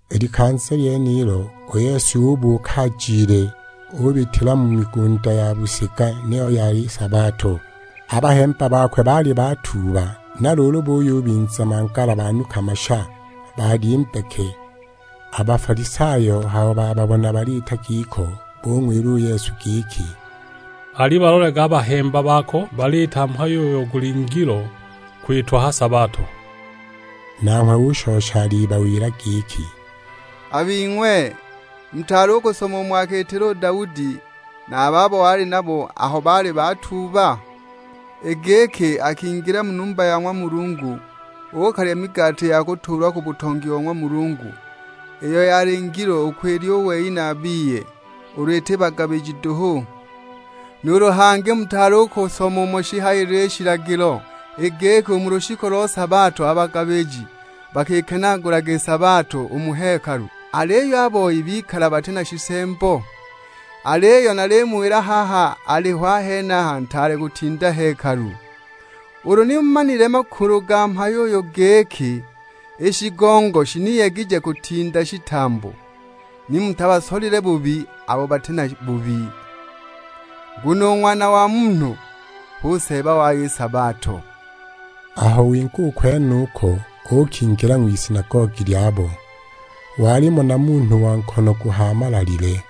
I likanza lyenilo u Yesu ubuuka ajile, ubitila mu migunda ya busiga, niyo yali sabato. A bahemba bakwe baali batuuba, na luulu buyubinza mangala banuka masha, balya i mbeke. A Bafalisayo aho bababona baliita giko, bung'wila u Yesu giki, "Alibalolage a bahemba bako; baliita mhayo uyo guli ngilo kwitwa ha sabato!" Nanghwe ushosha alibawila giki, "A bing'we mutaali u kusoma umo akiitila u Daudi na a babo wali nabo aho baali batuuba? I giki akingila mu numba ya ng'wa Mulungu, uukalya migati ya kutuulwa ku butongi bo ng'wa Mulungu, iyo yali ngilo u kwilya u wei na a biye, ulu iti bagabiji duhu? Nuulu hangi mutaali u kusoma umo shihayilile i shilagilo, i giki u mu lushiku lo sabato a bagabiji bakikenaagulaga i sabato u mu hekalu, aliyo a boi bikala bati na shisembo? Aliyo nalimuwila i haha aliho a henaha ntaale kutinda hekalu. Ulu ni mumanile a makulu ga mhayo uyu, giki: 'I shigongo shiniyegije kutinda shitambo;' ni mutabasolile bubi abo bati na bubi. Nguno u Ng'wana wa Munhu hu Seeba wayo ni sabato." Aho winga u kwenuko, uukingila ng'wisinagogi lyabo. Walimo na munhu wa nkono guhaamalalile.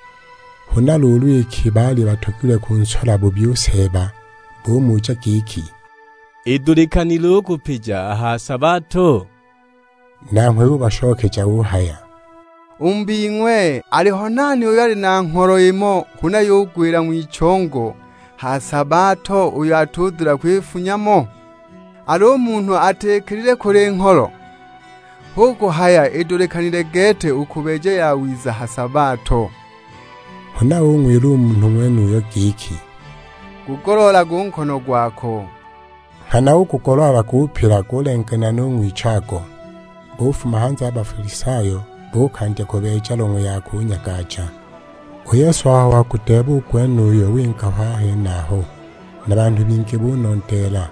Huna luulu iki baali batogilwe kunsola bubi u Seeba, bumuja giki, "Idulikanile u kupija a ha sabato?" Nanghwe ubashokeja uhaya, "U mu bing'we, aliho nani uyo ali na ngholo imo, huna yugwila ng'wichongo ha sabato uyo atibuucha kwifunya mo? Al'u munhu atikilile kule i ngholo? Hu kuhaya idulikanile gete u kubeeja yawiza a ha sabato!" Huna ung'wila u munhu ng'wenuyo giki, "Gugoloolage u nkono gwako." Nghana ugugoloola gupila, gulenganila nu ng'wichago. Bufuma hanze a Bafalisayo, buukandya kubeeja long'we ya kunyagaja! U Yesu aho wagudeeba u gwenuyo winga ho a henaho, na banhu bingi bunondeela.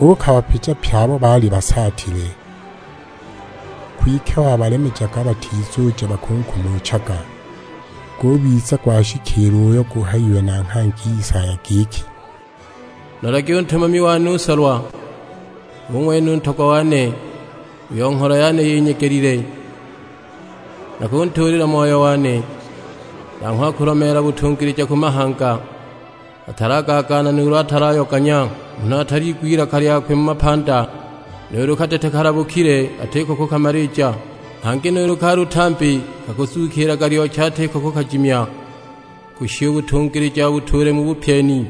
Uukabapija pye abo baali basaatile. Kwike wabalemejaga batizuja bakunkumuchaga. Gubiza gwashikiila uyo guhayiwe na nghangi Isaya giki, "Nolagi u Ntumami wane u Nsolwa, hu ng'wene u Ntogwa wane, uyo ngholo yane yinyegelile; Nakuntuulila Moyo wane, nanghwe akulomeela butungilija ku mahanga. Atalagaagaana nuulu atalayoganya; munhu ataliigwa ilaka lyakwe mu mapanda. Nuulu kadete kalabukile atiko kukamalija. Hangi nuulu kalutambi kakuzukiilaga lyochi atiko kukajimya, kushisha u butungilija abutuule mu bupyeni.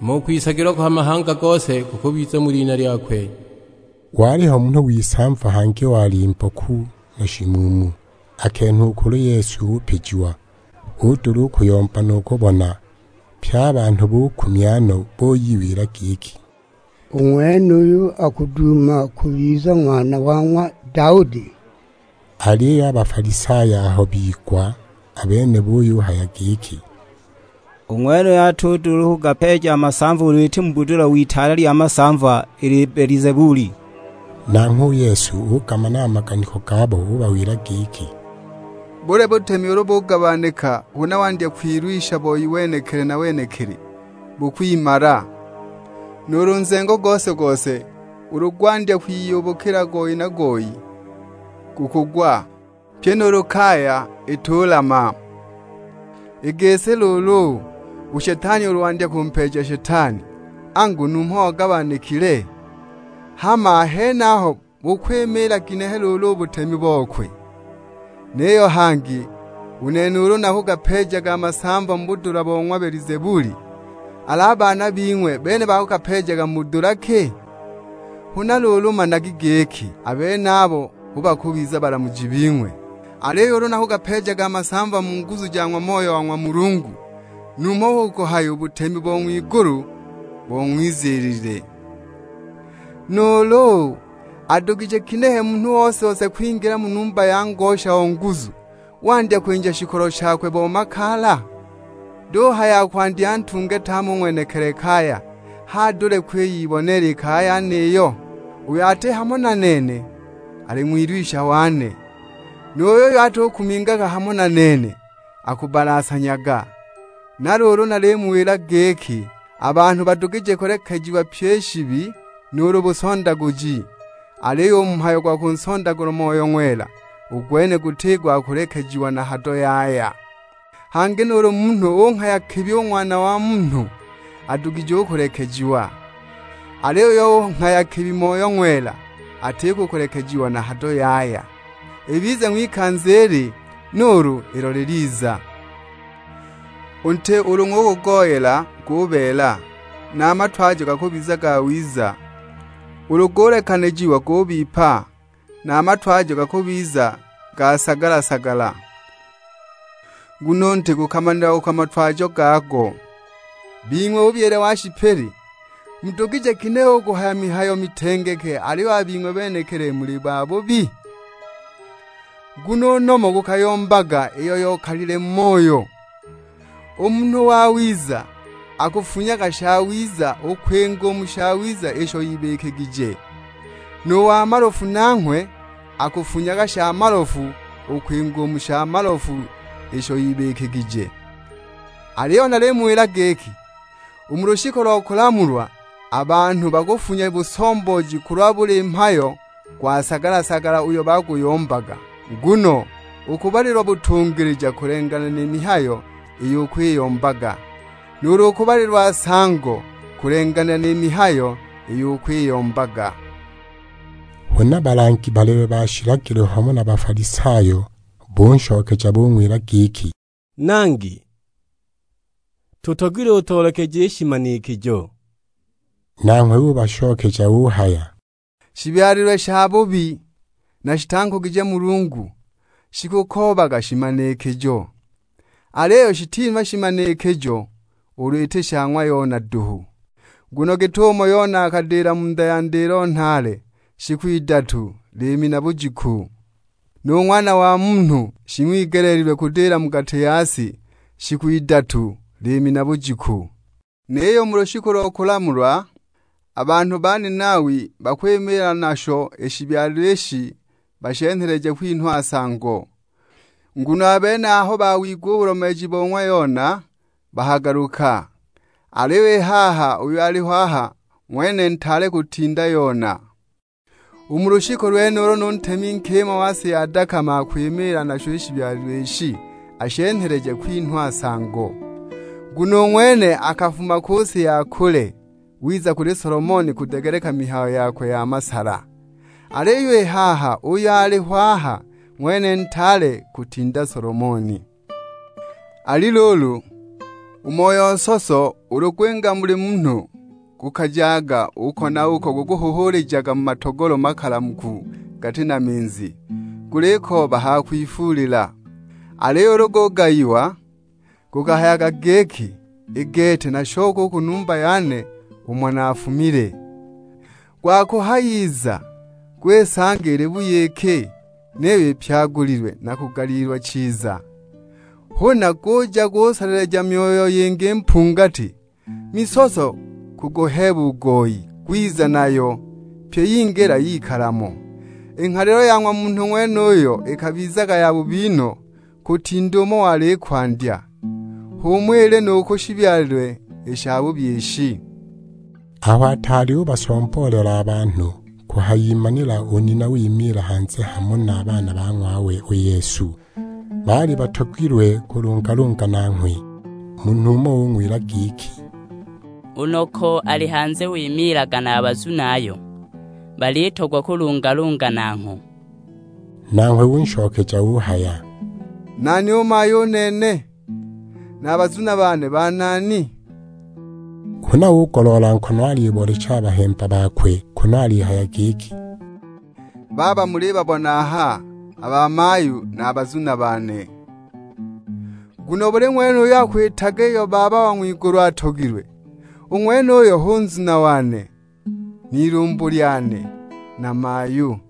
Hama u kwisagilwa kwa mahanga gose kukubiza mu lina lyakwe." Waliho munhu w'isamva, hangi wali mboku na shimuumu, akenhwa u kuli Yesu upijiwa; udula u kuyomba nu kubona. Pye a banhu bukumya no, buyiwila giki, "U ng'wenuyu akuduuma kubiza Ng'wana wa ng'wa Daudi?" Aliyo a Bafalisayo aho bigwa, a bene buyuhaya giki, "U ng'wenuyu atudula u kugapeeja a masamva ulu iti mu budula w'itaale lya masamva i Libelizebuli!" Nanghwe u Yesu ugamana a maganiko gabo, ubawila giki, "Buli butemi ulu bugabanika huna wandya kwilwisha boi wenekili na wenekili, bukwimala. Nuulu nzengo gose-gose ulu gwandya kwiyubukila goyi na goyi, gukugwa; pyi nuulu kaya itulama! I gisi luulu, u Shetani ulu wandya kumpeeja Shetani, angu numho ogabanikile. Hama a henaho bukwimiila ginehe luulu u butemi bokwe? Niyo hangi, u nene ulu nakugapeejaga a masamva mu budula bo ng'wa Belizebuli, al'a baana bing'we a bene bakagapeejaga mu budula ki? Huna luulu managi giki, a benabo hu bakubiza balamuji bing'we! Aliyo ulu nakugapeejaga a masamva mu nguzu ja ng'wa Moyo wa ng'wa Mulungu, numho hu kuhaya u butemi bo ng'wa Mulungu bong'wiziilile! "Nuulu, adugije ginehe munhu ose-ose kwingila mu numba ya ngosha o nguzu, wandya kwinja shikolo shakwe bo makaala? Duhaya akwandya antunge tame u ng'wenekili kaya, h'adule u kwiyiboneela i kaya yeniyo? Uyo ati hamo na nene, ali ng'wilwisha wane; nu yuyo atukumingaga hamo na nene, akubbalasanyaga! Na luulu nalimuwila giki, a banhu badugije kulekejiwa pyi i shibi, nuulu busondaguji. Aliyo u mhayo gwa kunsondagula Moyo Ng'wela, u gwene guti gwa kulekejiwa na hado yaya! Hangi nuulu munhu unghaya kibi u Ng'wana wa Munhu, adugije u kulekejiwa. Aliyo uyo unghaya kibi Moyo Ng'wela, atiko kulekejiwa na hado yaya; ibize ng'wikanza ili, nuulu ilo liliza!" "U nti ulu ng'ugugoyela gubeela, na a matwajo gakubiza gawiza. Ulu gulekanijiwa gubipa, na a matwajo gakubiza ga sagala-sagala, nguno u nti gukamanilagwa ku matwajo gago. Bing'we bubyile wa shipili, mudugije ginehe u kuhaya mihayo mitengeke aliyo a bing'we benekili muli babubi? Nguno u nomo gukayombaga iyo yokalile mu moyo! U munhu wawiza akafunyaga shawiza u kwinga u mu shawiza isho ibikigije; nu wa malofu nanghwe akafunyaga sha malofu u kwinga u mu sha malofu isho ibikigije. Aliyo nalimuwila giki, u mu lushiku lo kulamulwa, a banhu bakufunya busombooji kulwa buli mhayo gwa sagala-sagala uyo bakuguyombaga. Nguno ukubalilwa butungilija kulenganila ni mihayo iyo ukwiyombaga, nuulu ukubalilwa nsango kulenganila ni mihayo iyo ukwiyombaga!" Huna balangi balebe ba shilagilo hamo na Bafalisayo, bunshokeja bung'wila giki, "Nangi, tutogilwe utoolekeje shimanikijo." Nanghwe ubashokeja uhaya, "Shibyalilwe shabubi na shitankugije Mulungu, shikukoobaga shimanikijo. Aliyo shitinhwa shimanikijo, ulu iti sha ng'wa Yona duhu! Nguno git'umo Yona akadila mu nda ya ndilo nhaale shiku idatu liimi na bujiku, nu Ng'wana wa Munhu shing'wigeleelilwe kudila mu gati ya si shiku idatu, liimi na bujiku! Niyo u mu lushiku lo kulamulwa, a banhu ba Ninawi bakwimiila nasho i shibyalilwe ishi bashenheleje kwinhwa nsango; nguno a bene aho bawigwa u bulomeeji bo ng'wa Yona bakagaluka. Aliyo i haha uyo aliho aha ng'wene ntaale kutinda Yona. U mu lushiku lwenulo nu ntemi nkima wa si ya dakama akwimiila nasho i shibyalilwe ishi ashenheleje kwinhwa nsango; nguno u ng'wene akafuma ku si ya kule, wiza kuli Solomoni kudegeleka mihayo yakwe ya masala, aliyo i haha uyo aliho aha ng'wene ntaale kutinda Solomoni." "Ali luulu, u moyo nsoso ulu gwinga muli munhu, gukajaga uko na uko gukuhuhuulijaga mu matogolo makalamuku gati na minzi, gulikooba ha kwifuulila. Aliyo ulu gugayiwa, gukahayaga giki, 'I gete nashoke u ku numba yane umo naafumile!' Gwakuhayiza, gwisanga ili buyiki; niyo ipyagulilwe, na kugaliilwa chiza. Huna guja kusoleleja myoyo yingi mpungati, misoso kuguheeba u goyi, gwiza nayo; pyi yingila yikala mo. I nghalilo ya ng'wa munhu ng'wenuyo ikabizaga yabubi no, kutinda umo wali i kwandya. H'umo ili nu ku shibyalilwe i shabubi ishi!" Aho ataali ubasomboolela a banhu, kuhayimanila u nina wimiila hanze, hamo na a baana ba ng'wawe u Yesu; baali batogilwe kulungalunga nanghwe. Munhu umo ung'wila giki, "U noko ali hanze wimiilaga na a bazunayo; balitogwa kulungalunga nangho." Nanghwe unshokeja uhaya, "Nani u mayu u nene? Na a bazuna bane banani?" Huna ugoloola nkono aliboolecha a bahemba bakwe, kunu alihaya giki, "Baaba mulibabona aha a bamayu na a bazuna bane. Nguno buli ng'wene uyo akwitaga iyo Baba wa ng'wigulu atogilwe, u ng'wenuyo hu nzuna wane, n'ilumbu lyane, na mayu."